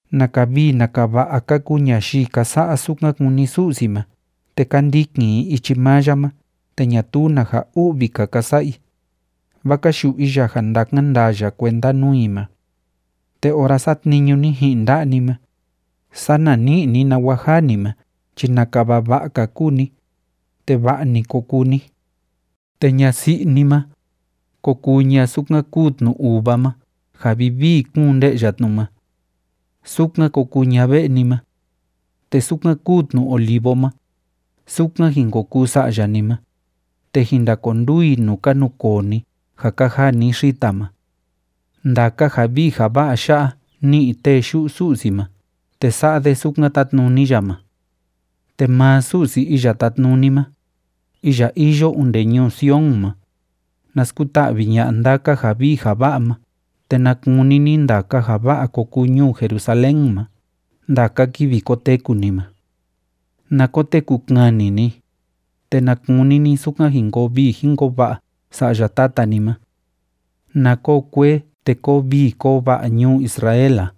¡Naka vii naka va'a ka kuu ñayii ka sa'a sukan kúni Su'si ma te ka ndikin i ichi maa ya ma te ñatuu na ja u'vi‑ka ka sa'a i, vaa ka yu'u i ya ja ndakan ndaa ya kuenda nuu i ma! Te ora satniñu ni ji'in nda'a ni ma, sana ní'i ni nawa jaa ni ma chi, ¡naka vava'a‑ka kuu ni, te va'a‑ni ko kuu ni! Te ñasi'i ni ma, ko kuu ña sukan kúu tnu uva ma ja vivii kúun nde'ya tnu ma. Sukan ko kuu ña ve'e ni ma. Te sukan kúu tnu olivo ma, sukan jin ko kuu sa'ya ni ma, te jin ndakonduu i nuu ka nukoo ni ja ka jaa ni xita ma. Ndaka ja vii ja va'a ya'a ni'i tee yu'u Su'si ma te sa'a de sukan tátnuni ya ma. Te maa Su'si Iya Tátnuni ma, iya iyo onde ñuu Sion ma, na skuta'vi ña'a ndaka ja vii ja va'a ma te na kuni ni ndaka ja va'a ko kuu ñuu Jerusalén ma ndaka kivi koteku ni ma. Na koteku kani ni, te na kuni ni sukan jin koo vii jin koo va'a sa'ya tata ni ma. Na koo kuee te kóo vii kóo va'a ñuu Israel a.